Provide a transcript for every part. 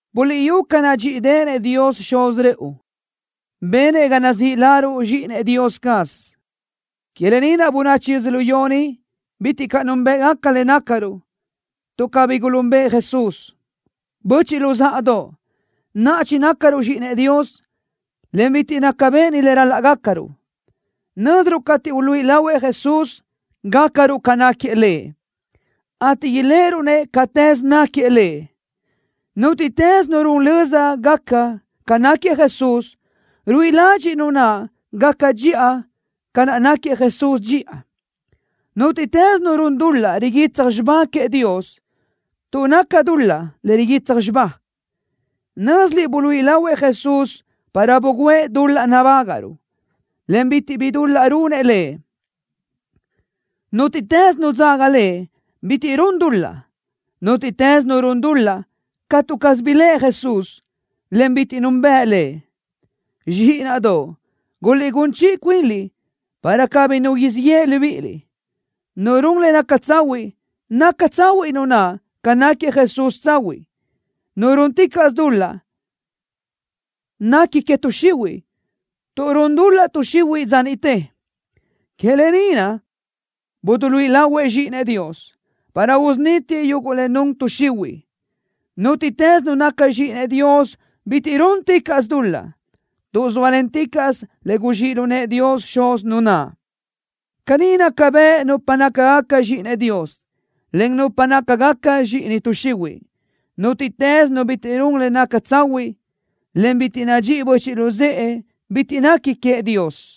Buliʼyú ca nadxíʼideʼenëʼ Dios Xuz rëʼu, benëʼ ga nazíʼi laruʼ zxíʼinëʼ Dios caz. Que lë ni naʼ bönachi yödzölió ni bitiʼ caʼ núnbëʼgaca le nácaruʼ, tuʼ cabí gulúnbeʼe Jesús. Böchiʼ luzáʼadoʼ, naʼa chinácaruʼ zxíʼinëʼ Dios, en bitiʼ naca béʼeni le ral-laʼ gácaruʼ. Nö́ziruʼ cateʼ uluíʼi lahuëʼ Jesús, gácaruʼ ca náquiëʼ Lëʼ, ateʼ iléʼeruʼ-nëʼ catëz náquiëʼ Lëʼ. Nútiʼtës nu run löza gaca ca náquiëʼ Jesús, ruíʼi ladxiʼ nu naʼ gaca dxiʼa ca naʼ náquiëʼ Jesús dxiʼa. Nútiʼtës nu run dul-laʼ riguitsaj xibá queëʼ Dios, tuʼ naca dul-laʼ le riguitsaj xibá. Nö́ziliʼ buluíʼi lahuëʼ Jesús para bugǘëʼ dul-laʼ nabágaʼruʼ, en bitiʼ bi dul-laʼ runëʼ Lëʼ. Nútiʼtës nu dzaga Lëʼ bitiʼ run dul-laʼ. Nútiʼtës nu run dul-laʼ catu caz biléʼe Jesús, en bitiʼ núnbeʼe Lëʼ. Zxíʼinaʼdoʼ, guliʼgún chiʼi cuinliʼ para cabí nu siʼ yeʼe libíʼiliʼ. Nu run le naca tsahuiʼ, naca tsahuiʼ nu naʼ ca naʼ náquiëʼ Jesús tsahuiʼ. Nu rúnticaʼsö dul-laʼ nequi que tuʼ xihuiʼ, tuʼ run dul-laʼ tuʼ xihuiʼ dza niʼte. Que lë ni naʼ buduluíʼi lahuëʼ Zxíʼinëʼ Dios, para usunítiëʼ yuguʼ le nun tuʼ xihuiʼ. Nútiʼtës nu naca zxíʼinëʼ Dios bitiʼ rúnticaʼsö dul-laʼ, tuʼ zóalenticaʼsö le guzxíʼ lu nëʼë Dios Xuz nu naʼ. Caní naca bëʼ nupa nácagaca zxíʼinëʼ Dios, en nupa nácagaca zxíʼini tuʼ xihuiʼ. Nútiʼtës nu bitiʼ run le naca tsahuiʼ, en bitiʼ nadxíʼi böchiʼ luzë́ʼe bitiʼ nequi queëʼ Dios.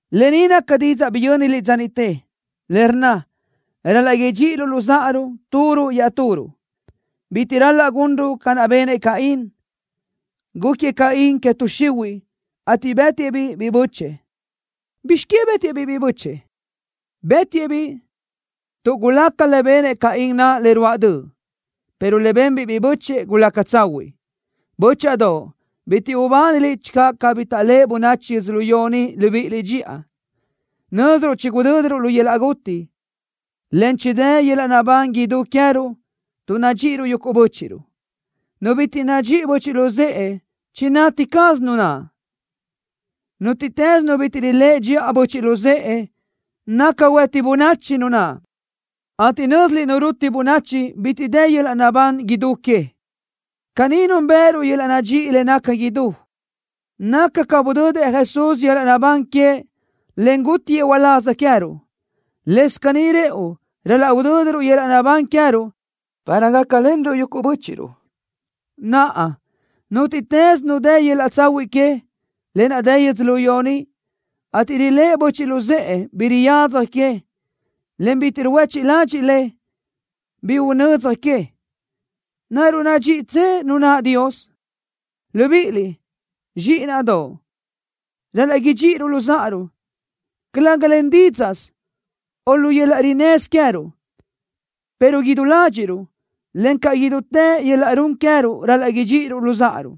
Lë ni naca didzaʼ biyö́niliʼ dza niʼte, le rnna: Ral-laʼ idxíʼiruʼ luzáʼaruʼ turuʼ iaʼturuʼ. Bitiʼ ral-laʼ gunruʼ ca naʼ benëʼ Caín. Gúquiëʼ Caín que tuʼ xihuiʼ, ateʼ bë́tiëʼ-biʼ biʼi bö́chëʼë. ¿Bizx que bë́tiëʼ-biʼ biʼi bö́chëʼë? Bë́tiëʼ-biʼ tuʼ gulaca le benëʼ Caín naʼ le ruáʼ döʼ, pero le benbiʼ biʼi bö́chëʼë, gulaca tsahuiʼ. Bö́chaʼadoʼ, bitiʼ ubániliʼ channö cabí taʼléʼe bönachi yödzölió ni libíʼiliʼ dxiʼa. Nö́ziruʼ chigudö́diruʼ lu yöl-laʼ guti, en chidë́ yöl-laʼ naʼbán idú queë́ruʼ tuʼ nadxíʼiruʼ yuguʼ bö́chiʼruʼ. Nu bitiʼ nadxíʼi böchiʼ luzë́ʼe, chinati caz nu naʼ. Nútiʼtës nu bitiʼ riléʼe dxiʼa böchiʼ luzë́ʼe, naca huëti bönachi nu naʼ, ateʼ nö́ziliʼ nu ruti bönachi bitiʼ dë yöl-laʼ naʼbán idú que. Caní núnbëʼëruʼ yöl-laʼ nadxíʼi le naca idú. Naca ca budödëʼ Jesús yöl-laʼ naʼbán queëʼ, en gútiëʼ uláz queë́ruʼ. Lëscaʼ caní rëʼu ral-laʼ udö́diruʼ yöl-laʼ naʼbán queë́ruʼ, para gácalenruʼ yuguʼ bö́chiʼruʼ. Naʼa, nútiʼtës nu dë yöl-laʼ tsahuiʼ que, lë naʼ dë yödzölió ni, ateʼ riléʼe böchiʼ luzë́ʼe, bi riyadzaj queëʼ, en bitiʼ ruhuéchiʼ ladxiʼ lëʼ, bi unödzaj queëʼ, ¿naruʼ nadxíʼitsö nu naʼ Dios? Libíʼiliʼ, zxíʼinaʼdoʼ, ral-laʼ idxíʼiruʼ luzáʼaruʼ, calëga len dídzaʼsö o lu yöl-laʼ rinnësö queë́ruʼ, pero idú ládxiʼruʼ, encaʼ len idútë yöl-laʼ run queë́ruʼ ral-laʼ idxíʼiruʼ luzáʼaruʼ.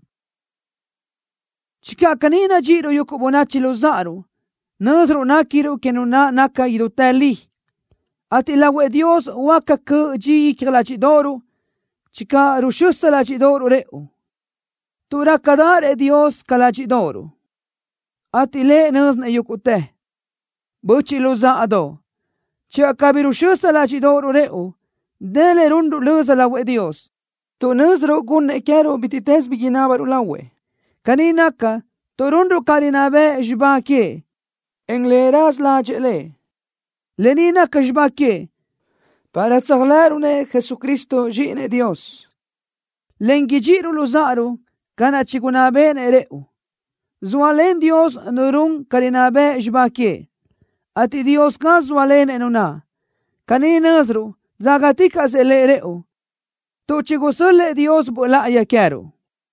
Channö caní nadxíʼiruʼ yuguʼ böchiʼ luzáʼaruʼ, nö́ziruʼ néquiruʼ que Nu naʼ naca idútë li, ateʼ lahuëʼ Dios huáca cöʼ dxi icja ládxiʼdoʼoruʼ channö ruxösa ládxiʼdoʼoruʼ rëʼu, tuʼ rácadaʼarëʼ Dios ca ládxiʼdoʼoruʼ, ateʼ Lëʼ nö́zinëʼ yúguʼtë. Böchiʼ luzáʼadoʼ, channö cabí ruxösa ládxiʼdoʼoruʼ rëʼu, dë le runruʼ löza lahuëʼ Dios tuʼ nö́ziruʼ gunnëʼ queë́ruʼ bítiʼtës bi inábaruʼ lahuëʼ. Caní naca, tuʼ runruʼ ca rinná bëʼ xibá queëʼ, en le raza ládxëʼë Lëʼ. Lë ni naca xibá queëʼ, para tséajlëʼëruʼ-nëʼ Jesucristo, Zxíʼinëʼ Dios, en idxíʼiruʼ luzáʼaruʼ ca naʼ chigunná béʼenëʼ rëʼu. Zóalen Dios nu run ca rinná bëʼ xibá queëʼ, ateʼ Dios caz zóalenëʼ nu naʼ. Caní nö́ziruʼ dzágaticaʼsëʼ Lëʼ rëʼu, tuʼ chigusö́l-lëʼë Dios Böʼ Láʼayi queë́ruʼ.